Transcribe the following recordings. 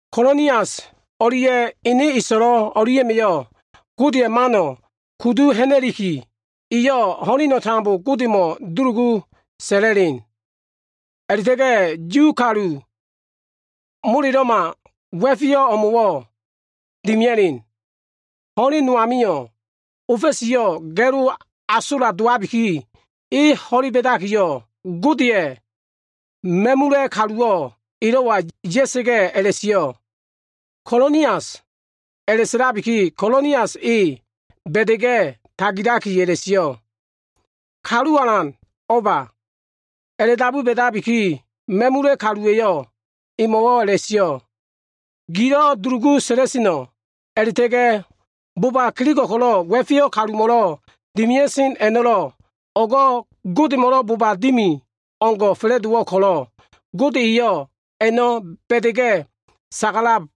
Konilias o꞉lia꞉ ene eso꞉lo꞉ o꞉lia꞉ma꞉yo꞉ Godeya꞉ mano꞉ kudu ha꞉na꞉likiyo꞉, iyo꞉ ho꞉leno꞉ tambo Godemo꞉ dulugu sa꞉la꞉len. A꞉la꞉ta꞉ga꞉ Yu kalu molelo꞉ma wa꞉feyo꞉ o꞉mo꞉wo꞉ dimia꞉len. Ho꞉len no amio꞉, ofa꞉siyo꞉ ga꞉lo asola dowabiki, e ho꞉le ba꞉dakiyo꞉, Godeya꞉ ma꞉mula꞉ kaluwo꞉ elo꞉wa ya꞉sa꞉ga꞉ a꞉la꞉sio꞉, “Konilias!” A꞉la꞉sa꞉labiki, Konilias e ba꞉da꞉ga꞉ tagilakiyo꞉ a꞉la꞉sio꞉, “Kalu alan, o꞉ba?” A꞉la꞉dabu ba꞉dabiki, ma꞉mula꞉ kaluwa꞉yo꞉ emo꞉wo꞉ a꞉la꞉sio꞉, “Gilo꞉ dulugu sa꞉la꞉seno꞉ a꞉la꞉ta꞉ga꞉ boba kelego꞉ ko꞉lo꞉ wa꞉feyo꞉ kalumo꞉lo꞉ dimia꞉sen a꞉no꞉lo꞉, o꞉go꞉ Godemo꞉lo꞉ boba dimi o꞉ngo꞉ fa꞉la꞉dowo꞉ ko꞉lo꞉, Gode eyo꞉ a꞉no꞉ ba꞉dakiyo꞉ sagalab.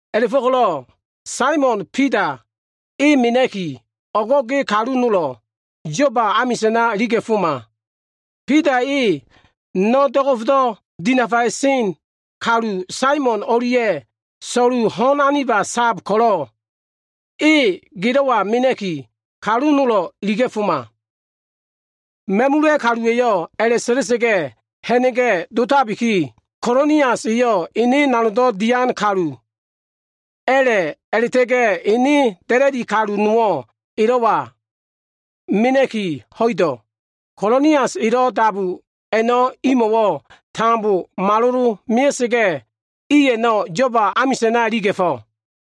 A꞉la꞉fo꞉ko꞉lo꞉ Saimon Bida e mena꞉ki, o꞉go꞉ ge kalu nolo꞉ Yoba amisa꞉na iliga꞉foma. Bida e no꞉ do꞉go꞉fdo꞉ dinafaya꞉sen kalu, Saimon o꞉lia꞉ so꞉lu ho꞉n aniba sab ko꞉lo꞉, e gelo꞉wa mena꞉ki, kalu nolo꞉ iliga꞉foma.” Ma꞉mula꞉ kaluwa꞉yo꞉ a꞉la꞉sa꞉la꞉sa꞉ga꞉ ha꞉na꞉ga꞉ dotabiki, Konilias eyo꞉ ene nanogdo꞉ dian kalu a꞉la꞉yo꞉ a꞉la꞉ta꞉ga꞉ ene da꞉la꞉di nowo꞉ elo꞉wa mena꞉ki ho꞉ido꞉. Konilias elo꞉ dabu a꞉no꞉ imo꞉wo꞉ tambo malolo꞉ mea꞉sa꞉ga꞉, i a꞉no꞉ Yoba amisa꞉na iliga꞉fo꞉.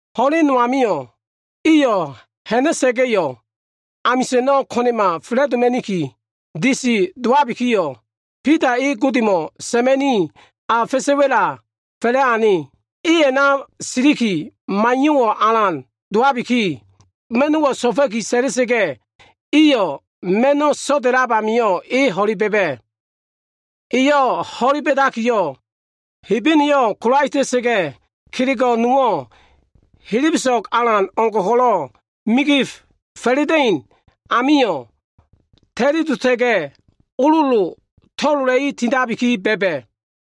Ho꞉len no amio꞉ iyo꞉ ha꞉na꞉la꞉ga꞉yo꞉, amisa꞉no꞉ ko꞉na꞉ma fa꞉la꞉doma꞉niki disi dowabikiyo꞉, Bida e Godemo꞉ sa꞉ma꞉ni, a fa꞉sa꞉ wa꞉la fa꞉la꞉ ane. E a꞉na silikiyo꞉ maiyo꞉wo꞉ alan dowabiki, ma꞉no꞉wo꞉ so꞉fa꞉ki sa꞉la꞉sa꞉ga꞉, iyo꞉ ma꞉no꞉ so꞉da꞉lab amio꞉ e ho꞉le ba꞉ba꞉. Eyo꞉ ho꞉le ba꞉dakiyo꞉, Hebeneyo꞉ kolaeta꞉sa꞉ga꞉, kelego꞉ nowo꞉ helebeso꞉g alan o꞉ngo꞉ ko꞉lo꞉ migif fa꞉la꞉da꞉in amio꞉ ta꞉lidota꞉ga꞉, ololo to꞉lola꞉i tindabi ba꞉ba꞉.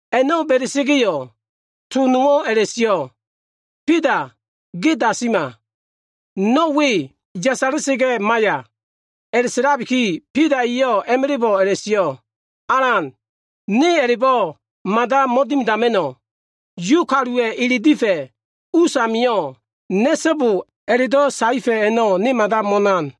A꞉no꞉ ba꞉da꞉sa꞉ga꞉yo꞉, to nowo꞉ a꞉la꞉sio꞉, “Bida, ge dasima! No꞉ we yasala꞉sa꞉ga꞉ maiya!” A꞉la꞉sa꞉labiki, Bida eyo꞉ a꞉ma꞉la꞉bo꞉ a꞉la꞉sio꞉, “Alan, ne a꞉la꞉bo꞉ mada mo꞉dimidama꞉no꞉! Yu kaluwa꞉ ele difa꞉ usamilo꞉ ‘Na꞉so꞉bo’ a꞉la꞉do꞉ saefa꞉ a꞉no꞉ ne mada mo꞉nan.”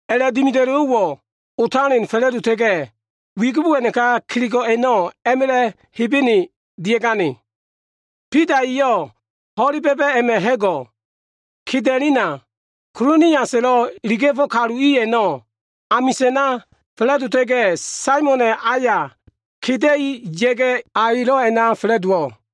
A꞉la꞉dimida꞉lowo꞉wo꞉ otalen fa꞉la꞉dota꞉ga꞉, wigibo a꞉naka kelego꞉ a꞉no꞉ a꞉ma꞉la꞉ Hebene dia꞉gane. Bida eyo꞉ ho꞉le ba꞉ba꞉ a꞉ma꞉ ha꞉go꞉ keda꞉lena, Koniliasa꞉lo꞉ iliga꞉fo꞉ kalu i a꞉no꞉ amisa꞉na fa꞉la꞉dowa꞉sa꞉ga꞉, Saimona꞉ ayo꞉ keda꞉i ya꞉ga꞉, a elo꞉ a꞉na fa꞉la꞉dowo꞉.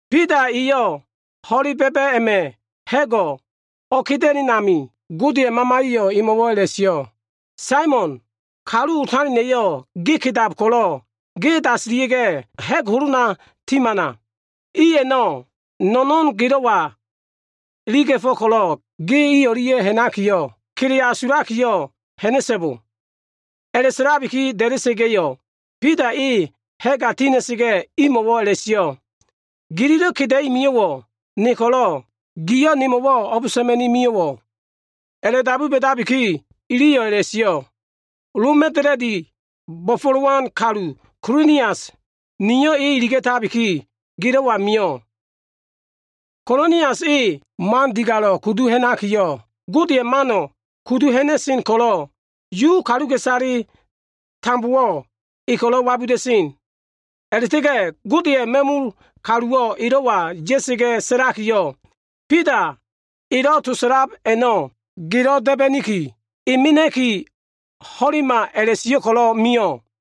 Bida eyo꞉ ho꞉le ba꞉ba꞉ a꞉ma꞉ ha꞉go꞉ o꞉keda꞉len amio꞉, Godeya꞉ Mamaya꞉yo꞉ emo꞉wo꞉ a꞉la꞉sio꞉, “Saimon, kalu otalena꞉yo꞉ ge kedab ko꞉lo꞉ ge dasila꞉sa꞉ga꞉, ha꞉g holona timana. I a꞉no꞉ no꞉no꞉n gelo꞉wa iliga꞉fo꞉ ko꞉lo꞉ ge i o꞉lia꞉ ha꞉nakiyo꞉, kele asulakiyo꞉ ha꞉na꞉so꞉bo.” A꞉la꞉sa꞉labiki da꞉da꞉sa꞉ga꞉yo꞉, Bida e ha꞉ga tina꞉sa꞉ga꞉, imo꞉wo꞉ a꞉la꞉sio꞉, “Gililo꞉ keda꞉i mio꞉wo꞉ ne ko꞉lo꞉, giliyo꞉ nemo꞉wo꞉ o꞉b sa꞉ma꞉ni mio꞉wo꞉?” A꞉la꞉dabu ba꞉dabiki, iliyo꞉ a꞉la꞉sio꞉, “Loma꞉ da꞉la꞉dilo꞉ bo꞉fo꞉lowan kalu Konilias eyo꞉ nio꞉ iliga꞉tabiki, gelo꞉wa mio꞉. Konilias, e man digalo꞉ kudu ha꞉nakiyo꞉, Godeya꞉ mano꞉ kudu ha꞉na꞉sen ko꞉lo꞉, Yu kaluka꞉isale iliyo꞉ tambo e ko꞉lo꞉ wabuda꞉sen. A꞉la꞉ta꞉ga꞉ Godeya꞉ ma꞉mul kaluwo꞉ elo꞉wa ya꞉sa꞉ga꞉ sa꞉lakiyo꞉, ‘Bida elo꞉ to sa꞉lab a꞉no꞉ gelo꞉ da꞉ba꞉niki, e mena꞉ki ho꞉lema’ a꞉la꞉sio꞉ ko꞉lo꞉ mio꞉.”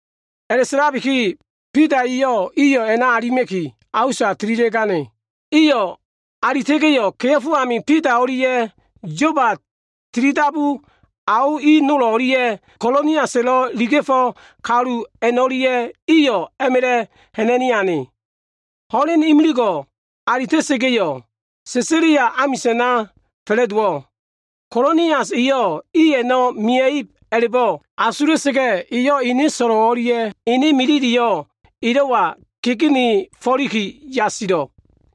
A꞉la꞉sa꞉labiki, Bida eyo꞉ iyo꞉ a꞉na alima꞉ki, a usa tililia꞉gane. Iyo꞉ alita꞉ga꞉yo꞉, kea꞉fo amio꞉ Bida o꞉lia꞉ Yoba tilidabu ao i nol o꞉lia꞉ Koniliasa꞉lo꞉ iliga꞉fo꞉ kalu a꞉no꞉lia꞉ iyo꞉ a꞉ma꞉la꞉ ha꞉na꞉ni ane. Ho꞉len imiligo꞉ alita꞉ga꞉yo꞉, Sesalia amisa꞉na fa꞉la꞉dowo꞉. Konilias eyo꞉ i a꞉no꞉ mia꞉ib a꞉la꞉bo꞉ asula꞉sa꞉ga꞉, eyo꞉ ene so꞉lo꞉ o꞉lia꞉ ene milileyo꞉ elo꞉wa kegenefo꞉liki yasilo꞉.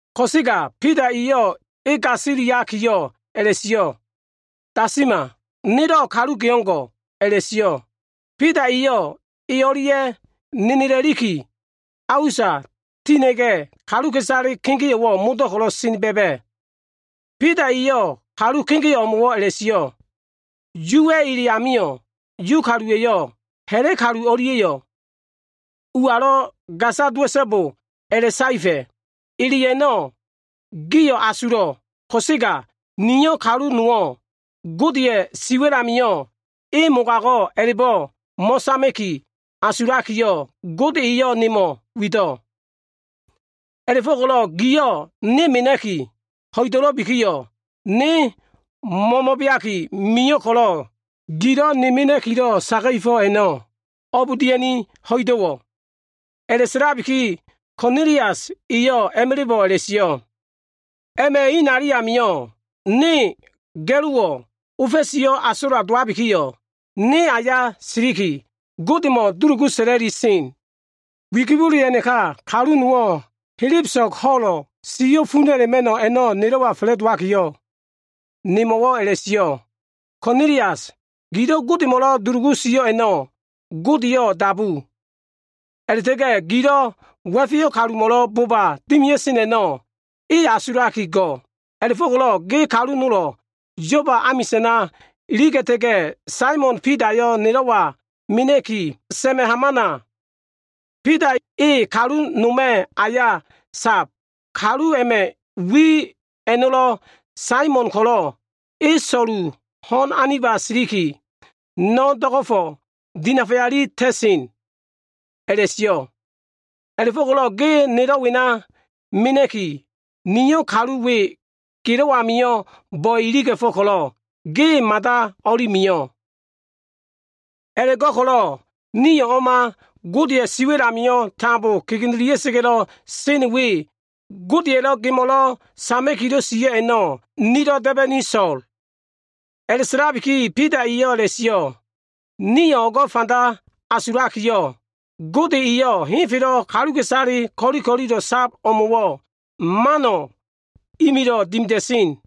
Ko꞉sega Bida eyo꞉ e gasiliakiyo꞉ a꞉la꞉sio꞉, “Dasima, nelo꞉ kalu ge o꞉ngo꞉” a꞉la꞉sio꞉. Bida eyo꞉ e o꞉lia꞉ nenela꞉liki, a usa tina꞉ga꞉, kaluka꞉isale kegeo꞉wo꞉ modo꞉ ko꞉lo꞉ sena ba꞉ba꞉. Bida eyo꞉ kalu kegeo꞉ o꞉mo꞉wo꞉ a꞉la꞉sio꞉, “Yuwa꞉ ele amio꞉, Yu kaluwa꞉yo꞉ ha꞉la꞉ kalu o꞉lia꞉yo꞉ ualo꞉ gasa ya꞉so꞉bo a꞉la꞉saefa꞉. Ele a꞉no꞉ gio꞉ asulo꞉ ko꞉sega niyo꞉ kalu nowo꞉ ‘Godeya꞉ siwa꞉l amio꞉ e mogago꞉’ a꞉la꞉bo꞉ mo꞉sama꞉ki asulakiyo꞉, Gode eyo꞉ nemo꞉ wido꞉. A꞉la꞉fo꞉ko꞉lo꞉ giliyo꞉ ne mena꞉ki ho꞉idabikiyo꞉, ne mo꞉mo꞉beaki mio꞉ ko꞉lo꞉, gililo꞉ ne mena꞉kilo꞉ saga꞉fo꞉ a꞉no꞉ o꞉b dia꞉ni ho꞉ido꞉wo꞉?” A꞉la꞉sa꞉labiki, Konilias eyo꞉ a꞉ma꞉la꞉bo꞉ a꞉la꞉sio꞉, “A꞉ma꞉ inali amio꞉, ne ga꞉lowo꞉ ofa꞉siyo꞉ asola dowabikiyo꞉, ne aya siliki Godemo꞉ dulugu sa꞉la꞉li sen. Wigibole a꞉naka kalu nowo꞉ helebeso꞉g ho꞉lo꞉, siyo꞉ funa꞉ a꞉la꞉ma꞉no꞉ a꞉no꞉ nelo꞉wa fa꞉la꞉dowakiyo꞉, nemo꞉wo꞉ a꞉la꞉sio꞉, ‘Konilias, gilo꞉ Godemo꞉lo꞉ dulugu sio꞉ a꞉no꞉ Godeyo꞉ dabu. A꞉la꞉ta꞉ga꞉ gilo꞉ wa꞉feyo꞉ kalumo꞉lo꞉ boba dimia꞉sen a꞉no꞉ E asulaki go꞉. A꞉la꞉fo꞉ko꞉lo꞉ ge kalu nolo꞉ Yoba amisa꞉na iliga꞉ta꞉ga꞉, Saimon Bidayo꞉ nelo꞉wa mena꞉ki, sa꞉ma꞉ hamana. Bida e kalu noma꞉ aya sab. Kalu a꞉ma꞉ wi a꞉no꞉lo꞉ Saimon ko꞉lo꞉, e so꞉lu ho꞉n aniba siliki no꞉ do꞉go꞉fo꞉ dinafaya꞉li ta꞉sen’ a꞉la꞉sio꞉. A꞉la꞉fo꞉ko꞉lo꞉ ge nelo꞉ wena mena꞉ki, niyo꞉ kalu we gelo꞉ amio꞉ bo꞉e iliga꞉fo꞉ ko꞉lo꞉ ge mada o꞉li mio꞉. A꞉la꞉go꞉ko꞉lo꞉ nio꞉ o꞉ma Godeya꞉ siwa꞉l amio꞉ tambo kegenelia꞉ga꞉lo꞉ sen we, Godeya꞉lo꞉ gemo꞉lo꞉ sama꞉kilo꞉ sio꞉ a꞉no꞉, nilo꞉ da꞉ba꞉niki so꞉l.” A꞉la꞉sa꞉labiki, Bida eyo꞉ a꞉la꞉sio꞉, “Niyo꞉ o꞉go꞉ fanda asulakiyo꞉, Gode eyo꞉ henfelo꞉ kaluka꞉isale ko꞉li ko꞉lilo꞉ sab o꞉mo꞉wo꞉, mano꞉ imilo꞉ dimida꞉sen.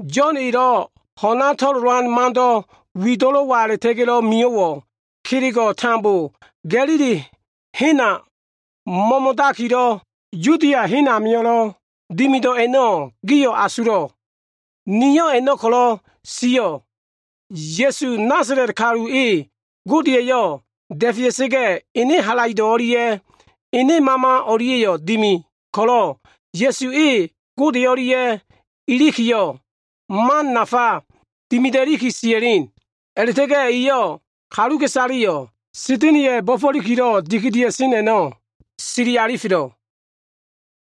Yo꞉n elo꞉ ho꞉na to꞉lolan mando꞉ wido꞉lo꞉wa a꞉la꞉ta꞉ga꞉ mio꞉wo꞉, kelego꞉ tambo Ga꞉lili hena mo꞉mo꞉dakilo꞉, Yudia hen amio꞉lo꞉ dimido꞉ a꞉no꞉ gio꞉ asulo꞉ Niyo꞉ a꞉no꞉ ko꞉lo꞉ sio꞉. Ya꞉su, Nasala꞉t kalu e, Gode eyo꞉ da꞉fea꞉sa꞉ga꞉yo꞉, ene halaido꞉ o꞉lia꞉ Ene Mama o꞉lia꞉yo꞉ dimi ko꞉lo꞉, Ya꞉su e, Gode o꞉lia꞉ ilikiyo꞉, man nafa dimida꞉liki sia꞉len. A꞉la꞉ta꞉ga꞉ eyo꞉ kaluka꞉isaleyo꞉ Sa꞉da꞉na꞉ya꞉ bo꞉fo꞉likilo꞉ dikidia꞉sen a꞉no꞉ sili alifelo꞉.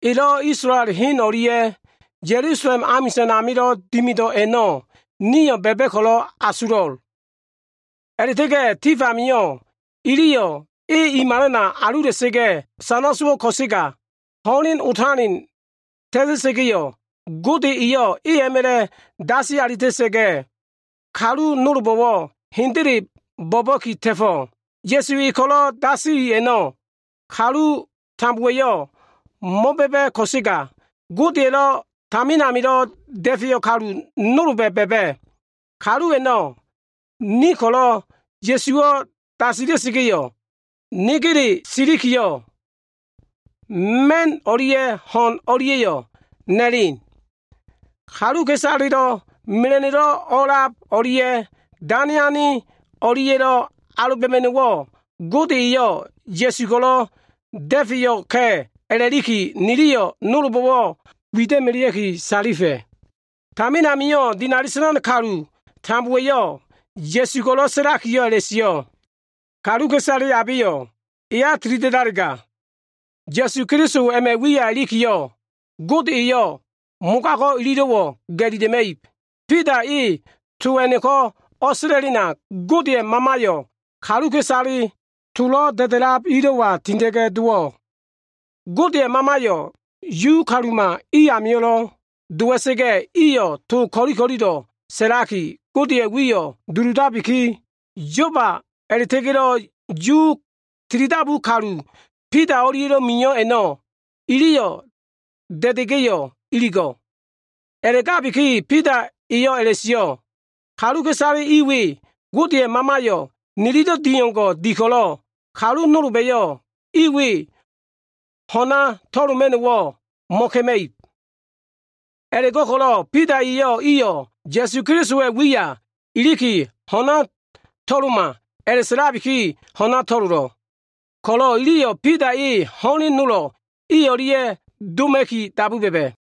Elo꞉ Yuwa꞉ hen o꞉lia꞉ Ya꞉lusalem amisa꞉n amilo꞉ dimido꞉ a꞉no꞉ nio꞉ ba꞉ba꞉ ko꞉lo꞉ asulo꞉. A꞉la꞉ta꞉ga꞉ tif amio꞉ iliyo꞉ e i malana alula꞉sa꞉ga꞉ sana sowo꞉ ko꞉sega, ho꞉len otaleno꞉ ta꞉ta꞉sa꞉ga꞉, Gode eyo꞉ e a꞉ma꞉la꞉ a꞉dasi alita꞉ga꞉, kalu nolbo꞉wo꞉ hendele bo꞉ba꞉ki ta꞉fo꞉. Ya꞉su e ko꞉lo꞉ dasili a꞉no꞉, kalu tambowa꞉yo꞉ mo꞉ba꞉ba꞉ ko꞉sega, Godeya꞉lo꞉ tamin amilo꞉ da꞉feyo꞉ kalu nolba꞉ ba꞉ba꞉. Da꞉feyo꞉ kalu a꞉no꞉ ni ko꞉lo꞉, Ya꞉suwo꞉ dasila꞉sa꞉ga꞉ ilikiyo꞉, negele siliki ma꞉n o꞉lia꞉ ho꞉n o꞉lia꞉yo꞉ na꞉len. Kaluka꞉isale mela꞉no꞉lo꞉ o꞉lab o꞉lia꞉ dane ane o꞉lia꞉lo꞉ alobanama꞉no꞉wo꞉, Gode eyo꞉ Ya꞉su ko꞉lo꞉ da꞉fe alifa꞉ka꞉ a꞉la꞉bo꞉, niliyo꞉ nolbo꞉ wida꞉melea꞉ki salifa꞉. Tamin amio꞉ dinali sa꞉lan kalu tambowa꞉yo꞉ Ya꞉su ko꞉lo꞉ sa꞉lakiyo꞉ a꞉la꞉sio꞉, ‘Kaluka꞉isale abeyo꞉ eya tilida꞉dalega, Ya꞉su Keliso a꞉ma꞉ wiya ilikiyo꞉, Gode eyo꞉ mogago꞉ ililo꞉wo꞉ ga꞉lila꞉ma꞉ib.’” Bida e to a꞉no꞉ko꞉ o꞉sa꞉la꞉lena, Godeya꞉ Mamayo꞉ kaluka꞉isale tolo꞉ da꞉da꞉lab ilo꞉wa tinda꞉ga꞉ dowo꞉. Godeya꞉ Mamayo꞉ Yu kaluma i amio꞉lo꞉ dowa꞉sa꞉ga꞉, iyo꞉ to ko꞉li ko꞉lilo꞉ sa꞉laki, Godeya꞉ wiyo꞉ dulugu sio꞉. Ililo꞉ sa꞉lab a꞉no꞉ Yoba a꞉la꞉ta꞉ga꞉lo꞉ Yu tilidabu kalu, Bida o꞉lia꞉lo꞉ mio꞉ a꞉no꞉, iliyo꞉ da꞉da꞉ga꞉yo꞉ iligo꞉. A꞉la꞉gabiki, Bida eyo꞉ a꞉la꞉sio꞉, “Kaluka꞉isale i we Godeya꞉ Mamayo꞉ nililo꞉ di o꞉ngo꞉ di ko꞉lo꞉, kalu nolba꞉yo꞉ i we ho꞉na to꞉loma꞉no꞉wo꞉ mo꞉ka꞉ma꞉ib.” A꞉la꞉go꞉ko꞉lo꞉ Bida eyo꞉ iyo꞉ Ya꞉su Kelisowa꞉ wiya iliki ho꞉na to꞉loma a꞉la꞉sa꞉labiki ho꞉na to꞉lolo꞉ ko꞉lo꞉, iliyo꞉ Bida e ho꞉len nolo꞉ i o꞉lia꞉ o꞉doma꞉ki dabu ba꞉ba꞉.